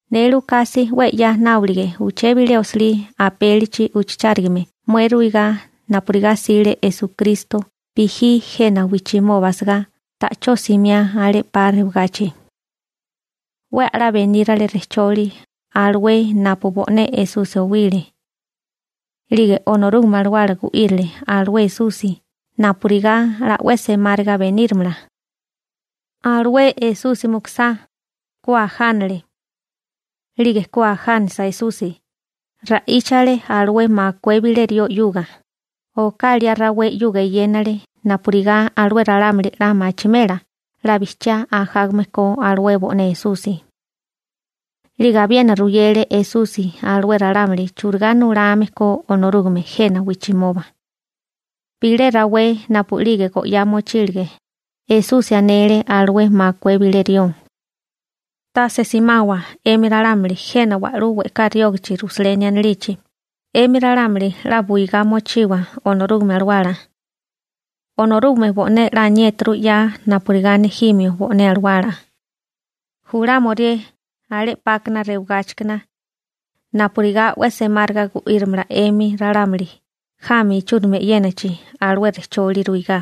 Ne Lukasi 'we 'ya nábolige uché bilé osilí apélichi ujchachárigame mué ruigá napurigá 'sile Esukristo bijí jena wijchimoba asagá ta'chó simiá alé 'pa rewagachi. 'We a'lá benírale rejcholi alué napu bo'né Esusi owile. 'Lige Onorúgame Alawala gu'írile alué Esusi napurigá 'la 'we semáriga benírimala. Alué Esusi mukusá, ku ajánale. 'Lige ku ajánisa Esusi, ra'íchale alué makué bilé rió 'yuga, oká liá rawé 'yuga eyénale napurigá alué ralámuli 'la machimela 'la bijchiá ajágame ko alué bo'né Esusi. 'Lige abiena ruyele Esusi alué ralámuli churigá nulame ko Onorúgame jena wijchimoba. Bilé rawé napu'lige go'yá mochílige, Esusi anele alué makué bilé rió: ―Tase simawa 'emi ralámuli jena wa'lú we'ká riógachi Rusaleni anilichi, 'emi ralámuli 'la buwigá mochiwa Onorúgame Alawala. Onorúgame bo'né 'la aniéturu 'ya napurigá nejimio bo'né alawala, julámorié alé 'pákana rewagáchikana, napurigá 'we semáriga gu'írimala 'emi ralámuli jami ichúrimi e'yénachi alué rejcholi ruigá.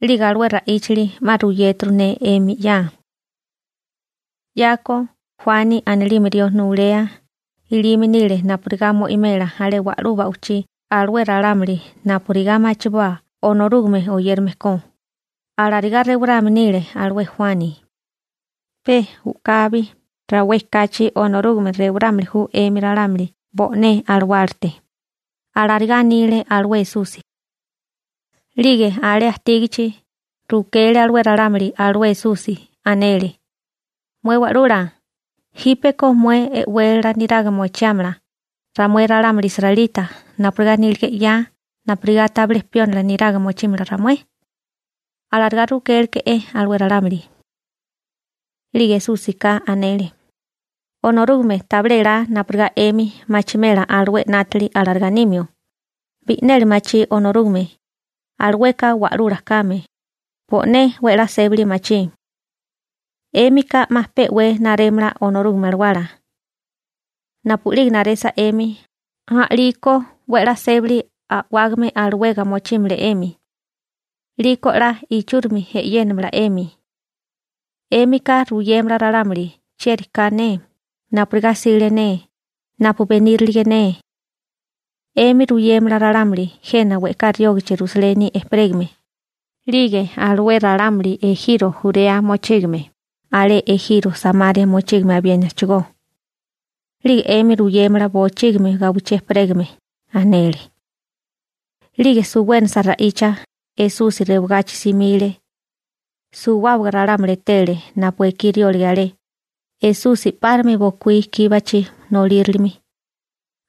'Lige alué ra'íchali 'ma ruyéturu ne 'emi 'ya. 'Yako, Juani anilime rió nulea ilime nile napurigá mo'imela alé wa'lú ba'wichí alué ralámuli napurigá machiboa Onorúgame oyérame ko, alarigá rewarame nile alué Juani. Pe u'kabi rawé kachi Onorúgame rewarámili ju 'emi ralámuli bo'né alawálate ―alarigá anile alué Esusi. 'Lige alé ajtígachi, rukele alué ralámuli alué Esusi, anele: ―Mué Wa'lula, ¿jípeko mué e'wélala niraga mochiámala ramué ralámuli israelita napurigá nílige 'ya napurigá tabilé piónila niraga mochímala ramué? ―alarigá rukéleke'é alué ralámuli. 'Lige Esúsika anele: ―Onorúgame tabilé elá napurigá 'emi machimela alué 'nátili alarigá nimio, bi'neli machí Onorúgame, alueka wa'lula kame, bo'né 'we 'la sébali machí. 'Émika 'ma pe'wé narémala Onorúgame Alawala. Napu'lige naresa 'emi, a'liko 'we 'la sébali a'wágame alawega mochímala 'emi. 'Liko 'la ichúrimi e'yénamala 'emi. 'Émika ruyémala ralámuli chieri ka ne, napurigá 'sile ne, napu benírilige ne. 'Emi ruyémala ralámuli jena we'ká riógichi Rusaleni ejperégame, 'lige alué ralámuli ejiro Jurea mochígame, alé ejiro Samaria mochígame abiénachigó. 'Lige 'emi ruyémala bochígimi gawichí ejperégame ―anele. 'Lige suwénasa ra'icha, Esusi rewagachi simile. Suwábaga ralámuli etele napu ekí riólige alé, Esusi 'párimi bokuí kíbachi nolírilimi.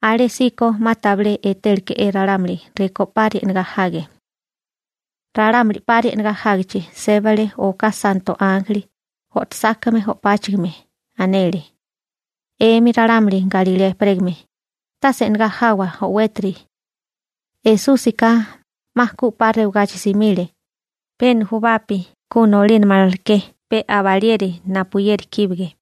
Alésíko 'ma tabilé etéleke'é ralámuli rekó 'pari e'negá jage. Ralámuli 'pari e'negá jágichi, sébale oká santo ánjeli, o'tosákame o'páchigime. Anele: ―'Emi ralámuli Galilea ejperégame, tase e'negá jawa o'wétiri. Esúsika 'ma ku 'pa rewagachi simile, pe nujubapi ku nolínamaleké pe abalieri napuyeri kíbige.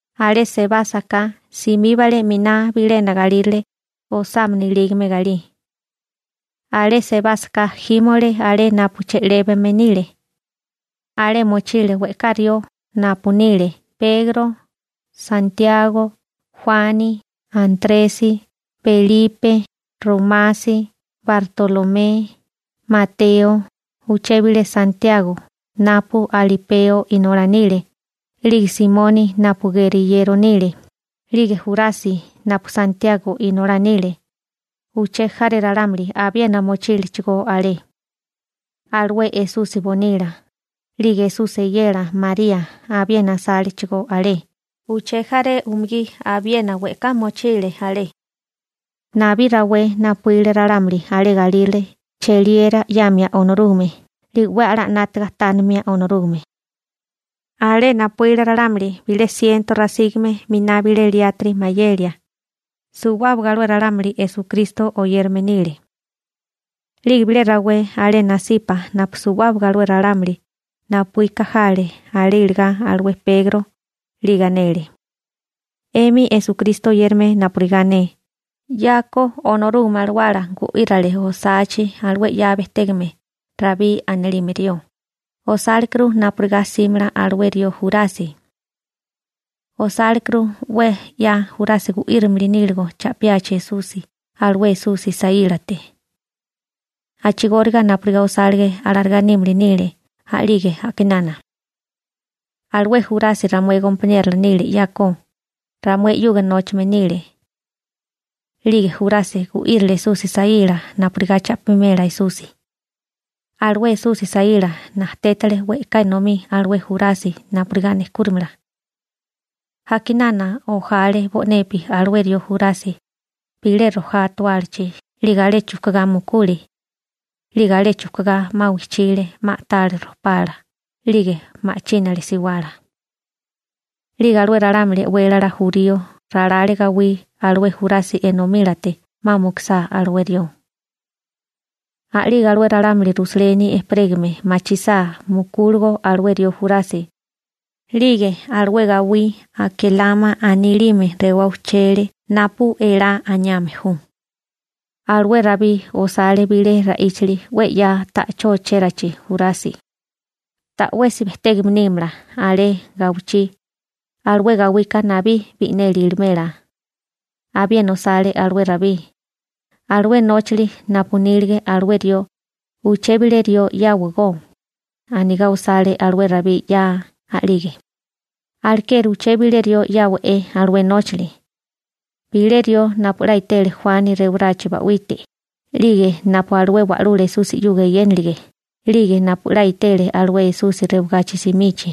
Alé sebásaká, simíbale 'miná bilena galírale osámana ilígame galí. Alé sebásaká jímole alé napu che'lébame nile. Alé mochile we'ká rió napu nile Pegro, Santiago, Juani, Antresi, Belipe, Romasi, Bartolomé, Mateo, uché bilé Santiago napu Alipeo inolá nile, 'lige Simoni napu geriyero nile, 'lige Jurasi napu Santiago inolá nile. Uché jaré ralámuli abiena mochílechigó alé. Alué Esusi nasípasi bonila 'lige nasípasi waíla, 'lige Esusi eyela María abiena asálechigó alé, uché jaré umugí abiena we'ká mochile alé. Nabí rawé napuíle ralámuli alé galírale cheliera 'yamia Onorúgame 'lige 'we a'lá 'nátaga tánimia Onorúgame. Alé napuíle ralámuli bilé siento rasígame miná bilé liátiri mayelia. Suwábaga alué ralámuli Esukristo oyérame nile. 'Lige bilé rawé alé nasipa napu suwábaga alué ralámuli napuíka jale alé iligá alué Pegro, 'lige anele: ―'Emi Esukristo oyérame napurigá ne, 'yako Onorúgame Alawala gu'írale osachi alué 'ya bejtégame Rabí anilime rió, osálekuru napurigá 'símala alué rió Jurasi. Osálekuru 'we 'ya Jurasi gu'írimili níligo cha'piachi Esusi alué Esusi saílate. A'chigóriga napurigá osálige alarigá nímili nile a'lige a'kinana. Alué Jurasi ramué gompaniérola nile 'yako, ramué 'yuga nóchame nile. 'Lige Jurasi gu'írile Esusi saíla napurigá cha'pimela Esusi. Alué Esusi saíla najtétale we'ká enomí alué Jurasi napurigá nejkúrimala. A'kinana ojale bo'nepi alué rió Jurasi bilé rojá atuálachi 'lige alé chujkugá mukule. 'Lige alé chujkugá, 'ma wijchile, 'ma a'tale rojpala, 'lige ma'chínale siwala. 'Lige alué ralámuli e'wélala jurío ralale gawí alué Jurasi enomílate 'ma mukusá alué rió. A'lige alué ralámuli Rusaleni ejperégame machisá mukúligo alué rió Jurasi, 'lige alué gawí Akelama anilime rewá ujchele napu elá aniame ju. Alué Rabí osale bilé ra'íchili 'we 'ya ta'chó ochérachi Jurasi: Ta'wesi bejtégame nímala alé gawichí. Alué gawika nabí bi'neli ilimela. Abiena osale alué Rabí: Alué nóchili napu iní alué rió, uché bilé rió 'yáwagó. Anigá osale alué Rabí 'ya a'lige. › Alekeri uché bilé rió 'yáwa'é alué nóchali. Bilé rió napu 'la etele Juani rewarachi ba'wite, 'lige napu alué Wa'lula Esusi 'yuga eyénilige, 'lige napu 'la etele alué Esusi rewagachi simichi,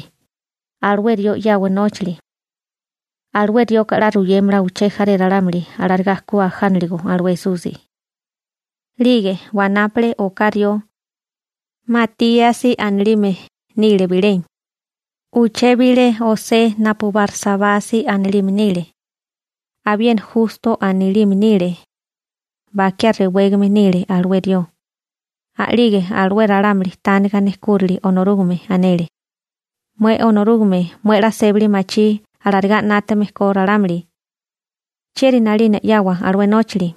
alué rió 'yawa nóchali. Alué rioka 'la ruyémala uché jaré ralámuli alarigá ku ajánaligo alué Esusi. 'Lige wanápale oká rió. Matíasi anilime nile bilé. Uché bilé José napu Barsabasi anilime nile. Abiena Justo anilime nile. Bakiá rewégame nile alué rió. A'lige alué ralámuli tániga nejkúrali Onorúgame, anele: ―Mué Onorúgame, mué 'la sébali machí alarigá 'nátame ko ralámuli. ¿Chieri 'nalina 'yawa alué nóchali,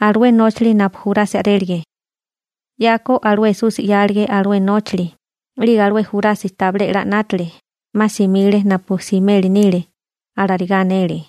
alué nóchali napu Jurasi a'rélige? 'Yako alué Esusi 'yálige alué nóchali, 'lige alué Jurasi tabilé 'la 'nátale, 'ma simile napu simeli nile ―alarigá anele.